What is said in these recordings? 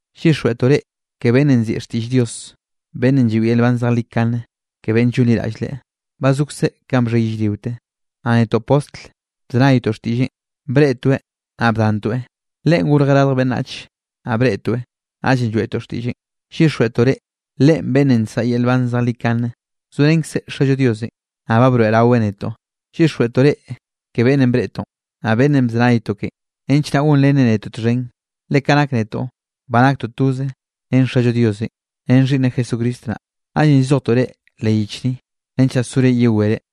Llyixjweꞌtoꞌ reꞌ ke beꞌnnenꞌ nziꞌi xtiꞌll Dios, beꞌnnenꞌ lloeꞌ yel nban zejlikane ke beꞌnn llonliraꞌll Leꞌe. Ba zokzeꞌ kanꞌ bxhe yellriote. Naꞌ netoꞌ Postl bzenaytoꞌ xtiꞌlleꞌn, breꞌtoeꞌ naꞌ bdantoeꞌ. Leꞌen gorjeꞌ radj beꞌnnach naꞌ breꞌtoeꞌ, naꞌllenꞌ lloeꞌtoꞌ xtiꞌlleꞌn. Llyixjweꞌtoꞌ reꞌ, Leꞌen beꞌnnenꞌ nsaꞌa yel nban zejlikane, zorenkzeꞌ Xallo Diosenꞌ, naꞌ ba broeꞌraweꞌ netoꞌ. Llyixjweꞌtoꞌ reꞌ ke beꞌnnenꞌ breꞌtoꞌn, naꞌ beꞌnnenꞌ bzenaytoꞌ kenꞌ, nench naꞌ gonrenre netoꞌ txhen. Le ka nak netoꞌ ba naktoꞌ toze ren Xallo Diosenꞌ, ren Xhiꞌnneꞌ Jesucristo naꞌ. Naꞌllenꞌ llzojtoꞌ reꞌ leꞌ yich ni, nench naꞌ sore yewere.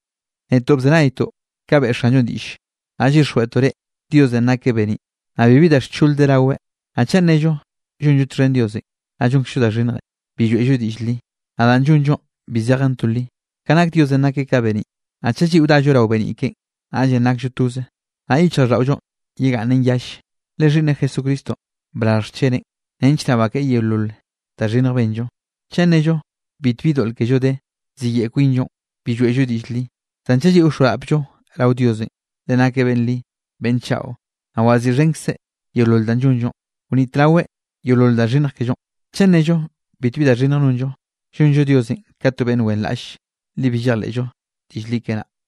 Netoꞌ bzenaytoꞌ ka beꞌe Xanllonꞌ diꞌlle, naꞌ llyixjweꞌtoꞌ reꞌ, Diosenꞌ nakeꞌ beniꞌ, naꞌ bibi da xchol de raweꞌ. Naꞌ chaꞌ nnello llonllo txhen Diosenꞌ, naꞌ llonkzllo da xhinnje, bi lloeꞌllo diꞌll li. Naꞌ danꞌ llonllonꞌ bi zejen to li. Ka nak Diosenꞌ nakeꞌ ka beniꞌ, naꞌ chaꞌ lliꞌo dallo rao beniꞌ keꞌen, naꞌllenꞌ nakllo toze, naꞌ yichjraꞌlldaꞌollonꞌ yegaꞌnnen yalle, le Xhiꞌnneꞌ Jesucristonꞌ brarj xcheneꞌn nench naꞌ bakeꞌe yeolol da xhinnj benllo. Chaꞌ nnello bitbi doꞌl kello de, ziyeꞌe kwinllo, bi lloeꞌllo diꞌll li. Zan chaꞌ lliꞌo wxoarapllo rao Diosenꞌ, Leꞌe nakeꞌ beꞌnn li, beꞌnn chaꞌo, naꞌ waziꞌxhenkzeꞌ yeolol danꞌ llonllonꞌ, wnitraweꞌ yeolol da xhinnj kellonꞌ. Chaꞌ nnello bitbi da xhinnj nonllo, llonllo Diosenꞌ ka to beꞌnn wenraꞌlle, le bi llejleꞌllo diꞌll li keꞌe naꞌ.